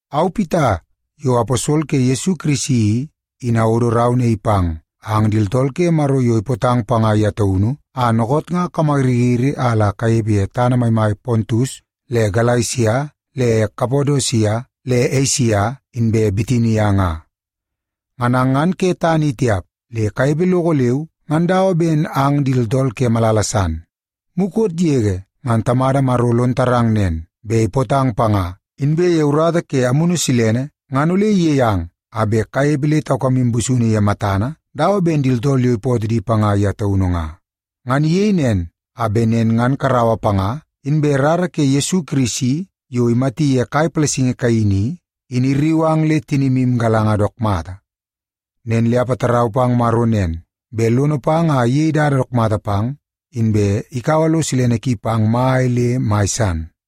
Au, Pita, yo aposol ke Yesu Kirisi i, in awodo rau naii pang ang di tooltool ke Maro yo ipootang panga ye taunu a dookoot nga kamayiriyiri a la kanepe ye tana maimai Pontus le Galesia le Kapadosia le Esia inbe Bitinia nga. Ngan ang ngan ke tana i tiap, le kanepe loko leu ngan dawa ben ang di tooltool ke malala san. Mukot yege ngan Tamada Maro lon tarang nen, bet ipootang panga, inbe ye urata ke Amunu Silene ngan ole iyei ang a bet kanepe le taukamu busunu ye matana dawa ben di tooltool yo ipootoo di panga ye taunu nga. Ngan iyei nen a bet nen ngan karaua panga, inbe rara ke Yesu Kirisi yo imati ye kai palasingi kaini i, in irriu ang le tinimu igalanga dook mata. Nen le apatarau pang Maro nen, bet lono pang a iyei dada dook mata pang, inbe ikaua lo silene ki pang mai le mai san.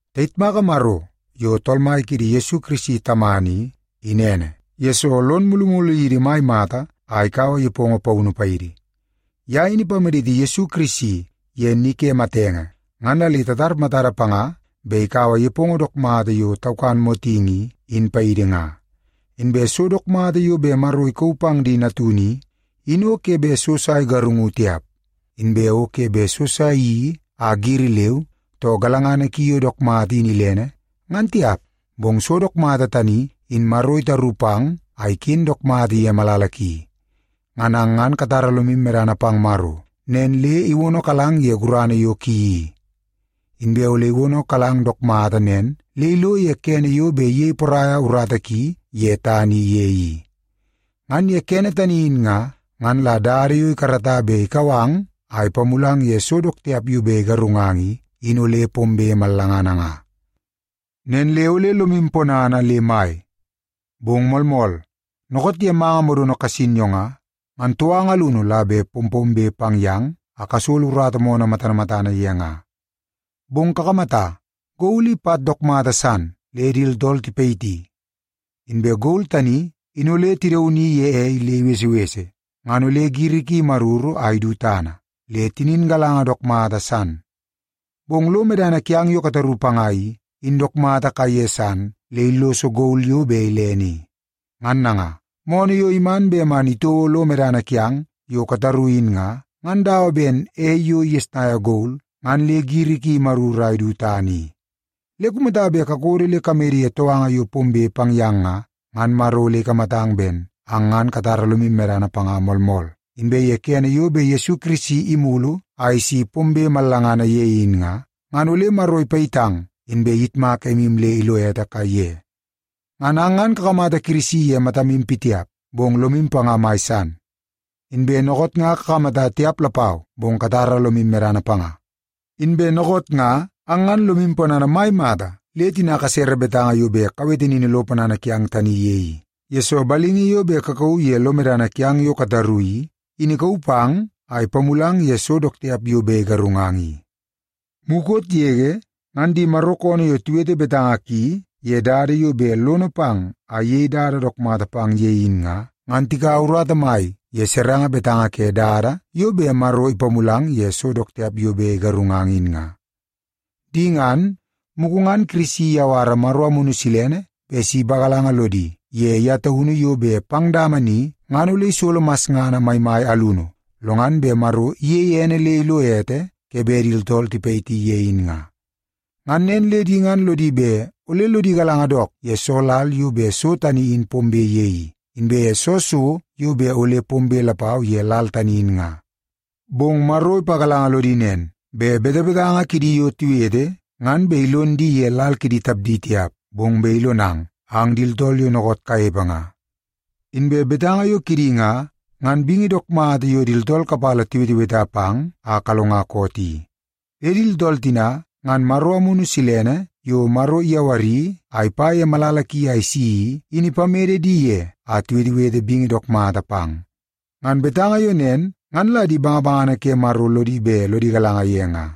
Tayitmaka Maro yo Tool Mai kiidi Yesu Kirisi Tamana i, in ene, yesoo lon mulumulu yidi mai mata a ikaua nepongo paunu paidi. Ye in ipamaditi Yesu Kirisi ye ni ke matenge ngan la le tatar matada panga bet ikaua nepongo dook mata yo taukan motingi i, in paidi nga. Inbe so dook mata yo bet Maro ikauu pang di natunu i, in o ke bet so sa igarungu tiap. Inbe o ke bet so sa iyeii a giri leu, too galangana ki yo dook mata in ilene, ngan tiap. Bong so dook mata tani, in Maro itaru pang a iken dook mata ye malala ki. Ngan ang ngan katara lomu medana pang Maro, nen le iwonokalang ye gurana yo ki i. Inbe ole iwonokalang dook mata nen le ilo ye kene yo bet iyei poraia urata ki ye tana i ye i. Ngan ye kene tani in nga, ngan la dada yo ikarata bet ikau ang a ipamulang ye so dook tiap yo bet igarungang i, in ole pombe mallangana nga. Nen le ole lomu ponana le mai! Bong moolmool, dookoot ye manga modono kasin yo nga, ngan touanga alunu la bet pompombe pang yang a kasolo urata moonoo matana matana ye nga. Bong kakamata, gol i pat dook mata san le di tooltool tipayiti. Inbe gol tani in ole tidauni ye ei le ibesebese, ngan ole giri ki imaruru a idu tana, le tinin galanga dook mata san. Bong lo medana kiang yo kataru panga i, in dook mata kaiye san le illoso gol yo bet ilene i. Ngan nanga, moonoo yo iman bet man itouo lo medana kiang yo kataru in nga, ngan dawa ben ei yo igesnaia gol ngan le giri ki imaruru a idu tana i. Le kumata bet kakodo le kamede ye touanga yo pombe pang yang nga, ngan Maro ole ikamatang ben ang ngan katara lomu medana panga moolmool, inbe ye kene yo bet Yesu Kirisi imulu a isi pombe mallangana ye in nga, ngan ole Maro ipayitang inbe iyitmak emu le ilo ete kaiye. Ngan ang ngan kakamata Kirisi ye matamu pitiap, bong lomu panga mai san. Inbe dookoot nga kakamata tiap lapau, bong katara lomu medana panga. Inbe dookoot nga ang ngan lomu ponana mai mata le tina kasere betanga yo bet kawete nini lo ponana kiang tani ye i, yesoo balingi yo bet kakauu ye lomu medana yo kataru i, in ikauu pang a ipamulang ye so dook tiap yo bet igarungang i. Mukot yege, ngan di Maro koonoo yo tiwete betanga ki ye dada yo bet lono pang a iyei dada dook mata pang ye in nga, ngan tikaua urata mai ye serenge betanga ke dada yo bet Maro ipamulang ye so dook tiap yo bet igarungang in nga. Di ngan, mugu ngan Kirisi iyawara Maro Amunu Silene bet si ipagalanga lodi ye ye taunu yo bet pang dama ni, ngan ole isolo masngana maimai alunu, lo ngan bet Maro iyeie ene le ilo ete ke bet di tooltool tipayiti ye in nga. Ngan nen le di ngan lodi bet ole lodi galanga dook ye soo lal yo bet so tani in pombe ye i, inbe ye soo so yo bet ole pombe lapau ye lal tani in nga. Bong Maro ipagalanga lodi nen, bet betebetanga kidi yo tiwete, ngan bet ilon di ye lal kidi tapdi tiap, bong bet ilonang, ang di tooltool yo dookoot kanepe nga. Inbe betanga yo kidi nga, ngan bingi dook mata yo di tooltool kapala tiweteweta pang a kalonga koot i. Le di tooltool tina, ngan Maro Amunu Silene yo Maro iyawari a ipa ye malala ki a isi i, in ipamede di ye a tiwetewete bingi dook mata pang. Ngan betanga yo nen ngan la di bangabangana ke Maro lodi bet lodi galanga ye nga.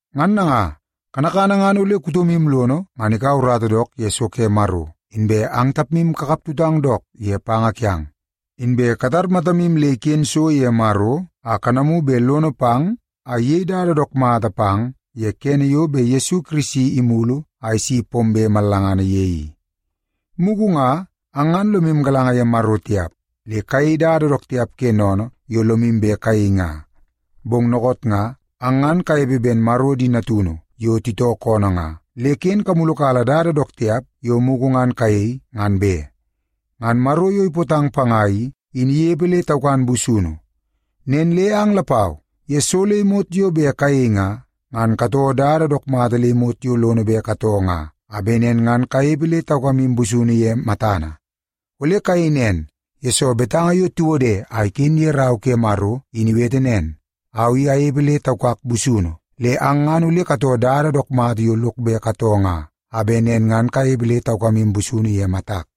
Ngan nanga, kanakana ngan ole kutomu lono ngan ikaua urata dook ye so ke Maro, inbe ang tapmu kakap tutang dook ye panga kiang. Inbe katar matamu le iken so ye Maro a kanamu bet lono pang a iyei dada dook mata pang ye kene yo bet Yesu Kirisi imulu a isi pombe mallangana ye i. Mugu nga ang ngan lomu galanga ye Maro tiap, le kayei dada dook tiap ke sennene yo lomu bet kayei nga. Bong dookoot nga, ang ngan kanepe ben Maro di natunu yo titoo koonoo nga, le ken kamulukala dada dook tiap yo mugu ngan kayei, ngan be. Ngan Maro yo ipootang panga i, in inepe le taukan busunu. Nen le ang lapau, ye so le imot yo bet kayei nga, ngan katoo dada dook mata le imot yo lono bet katoo nga, a bet nen ngan kanepe le taukamu busunu ye matana. Ole kayei nen, yesoo betanga yo tiwode a iken ye Rau ke Maro in iwete nen, “Au i anepe le taukak busunu, le ang ngan ole katoo dada dook mata yo lok bet katoo nga, a bet nen ngan kanepe le taukamu busunu ye matak.”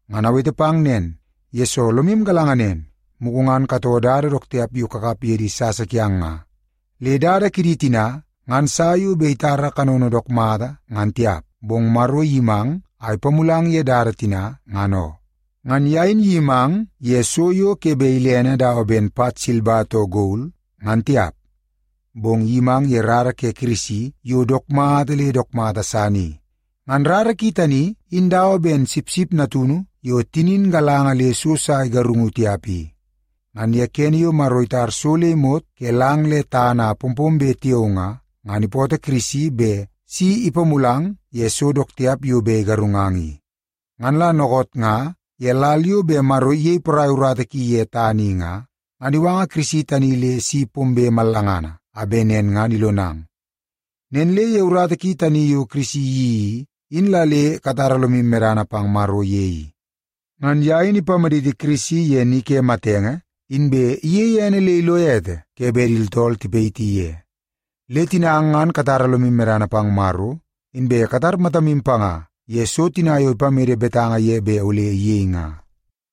Ngan awete pang nen, yesoo lomu galanga nen, mugu ngan katoo dada dook tiap yo kakap ye di sasa kiang nga. Le dada kidi tina, ngan sa yo bet itara kanono dook mata ngan tiap, bong Maro iyimang a ipamulang ye dada tina, ngan oo. Ngan ye in iyimang ye so yo ke bet ilene dawa ben pat silba too gol, ngan tiap. Bong iyimang ye rara ke Kirisi yo dook mata le dook mata san i. Ngan rara ki tani in dawa ben sipsip natunu yo tinin galanga le so sa igarungu tiap i. Ngan ye kene yo Maro itar so le imot ke lang le tana a pompombe tiao nga, ngan ipootoo Kirisi bet si ipamulang ye so dook tiap yo bet igarungang i. Ngan la dookoot nga ye lal yo bet Maro iyei porai urata ki ye tana i nga, ngan iwanga Kirisi tani le si pombe mallangana a bet nen ngan ilonang. Nen le ye urata tani yo Kirisi iyeii i, in la le katara lomu medana pang Maro ye i. Ngan ye in ipamaditi Kirisi ye ni ke matenge, inbe iyeie ene le ilo ete ke bet di tooltool tipayiti ye. Le tina ang ngan katara lomu medana pang Maro, inbe katar matamu panga ye so tina yo ipamede betanga ye bet ole iyei nga.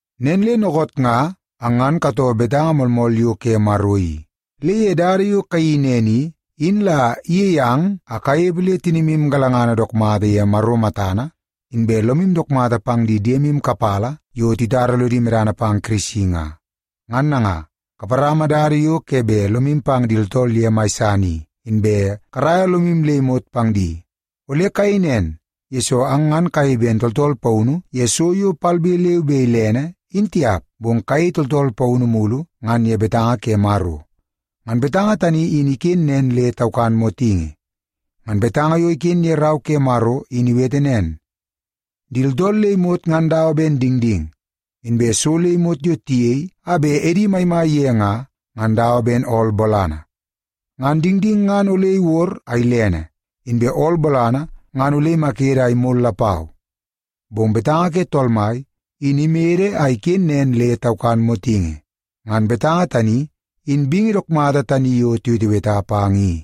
Nen le dookoot nga ang ngan katoo betanga moolmool yo ke Maro i, le ye dada yo kayeii nen i, in la iyei ang a kanepe le tinimu galangana dook mata ye Maro matana, inbe lomu dook mata pang di diemu kapala yo titara lodi medana pang Kirisi nga. Ngan nanga, kaparama dada yo ke bet lomu pang di tooltool ye mai san i, inbe karaia lomu le imot pang di. Ole kayei nen, yesoo ang ngan kayei ben tooltool paunu ye so yo palbe leu be ilene, in tiap, bong kayei tooltool paunu mulu ngan ye betanga ke Maro. Ngan betanga tani in iken nen le taukan motingi. Ngan betanga yo iken ye Rau ke Maro in iwete nen, “Di tooltool le imot ngan dawa ben dingding. Inbe so le imot yo tiyei a bet edi maimai ye nga, ngan dawa ben ool bolana. Ngan dingding ngan ole iwod a ilene, inbe ool bolana ngan ole imakede a imol lapau. Bong betanga ke Tool Mai, in imede a iken nen le taukan motingi.” Ngan betanga tani, in bingi dook mata tani yo tiweteweta pang i.